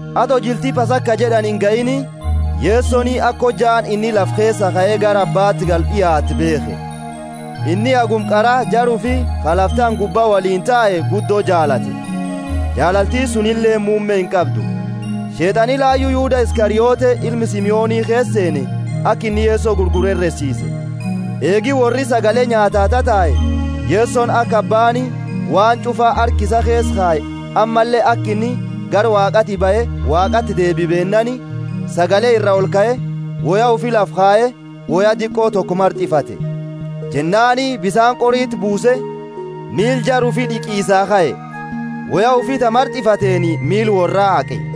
Ato jilti Pasaka jed'ani ingahiini, Yesoni aka hojjaani inni lafa keesaa kae gara Abbati galu d'iaatte beekhe. Inni haguma qara jara ufi ka lafa tana gubba woliini tae guddo jaalate, jaalalti sunileeni muumme inqabdu. Sheet'ani layu Yuda Iskariote, ilma Simoni, keesa seene, aka inni Yeso gurguru heresiise. Eegi worri sagale nyaataa tatae, Yesoni aka Abbaani waan ch'ufa harka isaa keesa kaye, ammalle aka inni gara Waaqaati bahe Waaqati deebiu beennaani, sagale ira olkae, woya ufi lafa kaye, woya diqo toko mart'ifate. Jennaani bisaani qoriti buuse, miila jara ufi d'iqisaa kae, woya ufi ta mart'ifateeni miila worraa haaqe.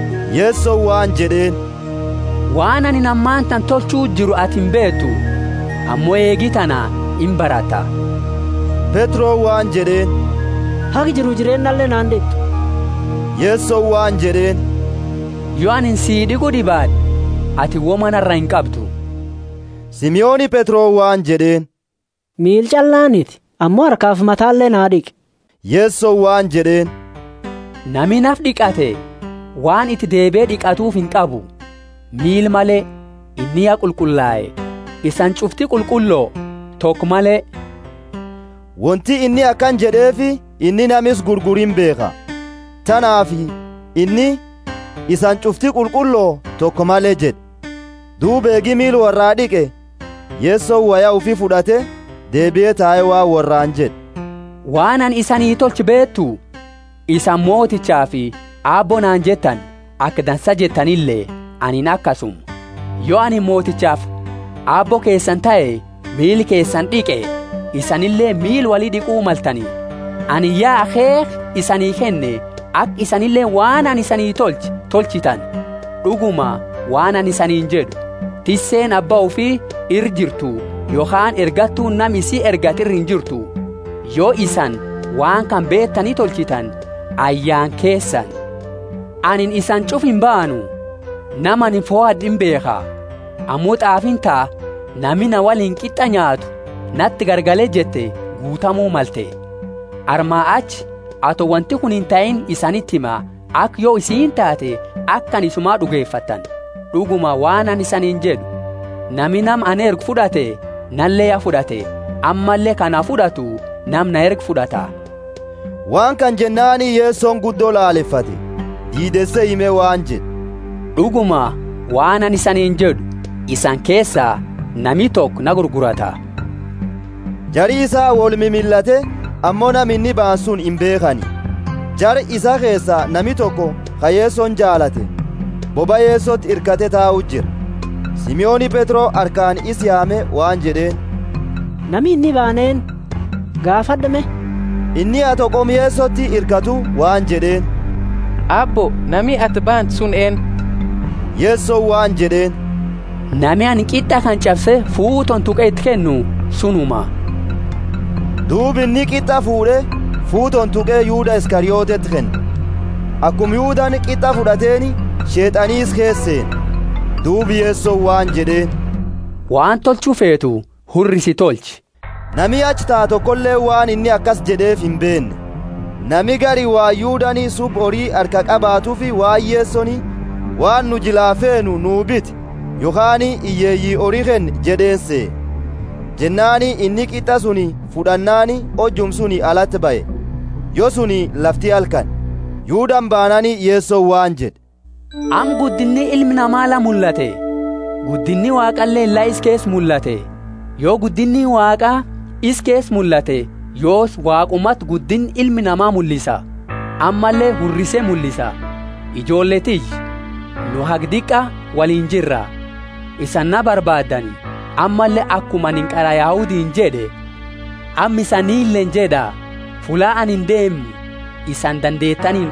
Yesoni waan jed'eeni, Waan anini ammatana tolchuu jiru ati imbeetu, ammo eegi tana imbaratta. Petroni waan jed'eeni, Haga jiru jireennale na ind'it'u! Yesoni waan jed'eeni, Yo anini si d'iqu d'ibaad'e, atini woma nara inqabdu. Simoni Petroni waan jed'eeni, Miila ch'allaaniti, ammo harkafi matale na d'iqi. Yesoni waan jed'eeni, Nami nafa d'iqate waan iti deebie d'iqatuufi inqabu, miila male, inni ya qulqullae. Isani ch'ufti qulqullo, toko male. Wonti inni akana jed'eefi, inni nama isa gurguru imbeekha; tanaafi inni, Isani ch'ufti qulqullo, toko male jed'e. Duuba eegi miila worraa d'iqe, Yesoni woya ufi fud'ate, deebie tae waan worraani jed'e, Waan anini isanii tolche beetu? Isani Motichafi Aabbo naani jettani, aka dansa jettanile, anini akasuma. Yo anini Motichafi Aabbo keesani tahe miila keesani d'iqe, isanileeni miila woli d'iqu maltani. Anini ya akheekha isanii kenne aka isanileeni waan anini isani tolche tolchitani. D'uguma, waan anini isaniini jed'u, Tisseeni abba ufi ira injirtu, yokhaani ergattuuni nama isii ergate ira injirtu. Yo isani waan kana beetani tolchitani, ayyaana keesani! Anini isani ch'ufa imbaanu; nama anini fohad'e imbeekha. Ammo t'aafiini ta, Nami na woliini qit'a nyaatu nati garagala jette guutamu malte. Armaa achi ato wonti kuni intahiini isaniti hima, aka yo isiini taate, aka anini Isuma d'ugefattani. D'uguma, waan anini isaniini jed'u, Nami nama ani ergu fud'ate, nale ya fud'ate; ammalle ka na fud'atu nama na erge fud'ata. Waan kana jennaani Yesoni guddo lalefate, diideese hime waan jed'e, D'uguma, waan anini isaniini jed'u, Isani keesa, nami toko na gurgurata. Jari isaa woli mimillate, ammo nama inni baane suni imbeekhani. Jara isaa keesa nami toko, ka Yesoni jaalate, bobaa Yesoti hirkate tau jira. Simoni Petro harkaani isa yaame waan jed'eeni, Nama inni baanu eennu? Gaafad'u me. Inni, ato qoma Yesoti hirkatu, waan jed'eeni, Aabbo, nami ati baantu suni eennu? Yesoni waan jed'eeni, Nami anini qit'a kana ch'abse fuutooni tuqe iti kennu sunuma. Duuba inni qit'a fuud'e, fuutooni tuqe Yuda Iskarioteti kenne. Akuma Yudani qit'a fud'ateeni, Sheet'ani isa keesa seene. Duuba Yesoni waan jed'eeni, Waan tolchu feetu hurrisi tolchi. Nami achi tau tokoleeni waan inni akasi jed'eefi imbeenne. Nami gari waan Yudani subba hori harkaa qabatuufi waan Yesoni, Waan nu jilaa feenu nu biti, yokhaani, Hiyyeeyii hori kenni jed'eeni sehe. Jennaani inni qit'a suni fud'annaani hojuma suni alati bahe. Yo suni lafti halkani. Yudani bannaani Yesoni waan jed'e, Amma guddinni Ilma Nama la mullate, guddinni Waaqaleeni la isa keesa mullate. Yo guddinni Waaqa isa keesa mullate, yoosi Waaqumati guddinna Ilma Nama mullisa, ammalle hurrise mullisa. Ijoolle tiyya, nu haga diqa woliini jira. Isani na barbaadani, ammalle akuma anini qara Yahudiini jed'e amma isanileeni jed'a, fulla anini deemu isani dandeetani ind'uftani.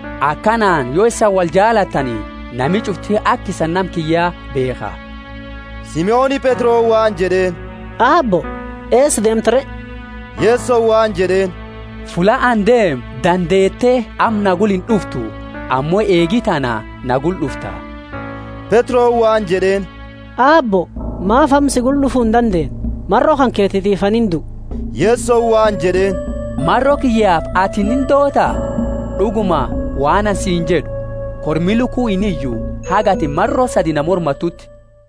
Akanaani yo isani woljaalatani nami ch'ufti aka isani nama kiyya beekha. Simoni Petroni waan jed'eeni, Aabbo, eesa deemta re? Yesoni waan jed'eeni, Fulla ani deemu dandeete amma na gula ind'uftu; ammo eegi tana na gula d'ufta. Petroni waan jed'eeni, Aabbo, maafi amma si gula d'ufu indandeenne? Maro kanketiifi anini indua. Yesoni waan jed'eeni, Maro kiyyafi atini indoota? D'uguma, waan anini siini jed'u, Kormi luku iniyu, haga atini maro sadi na mormatuuti.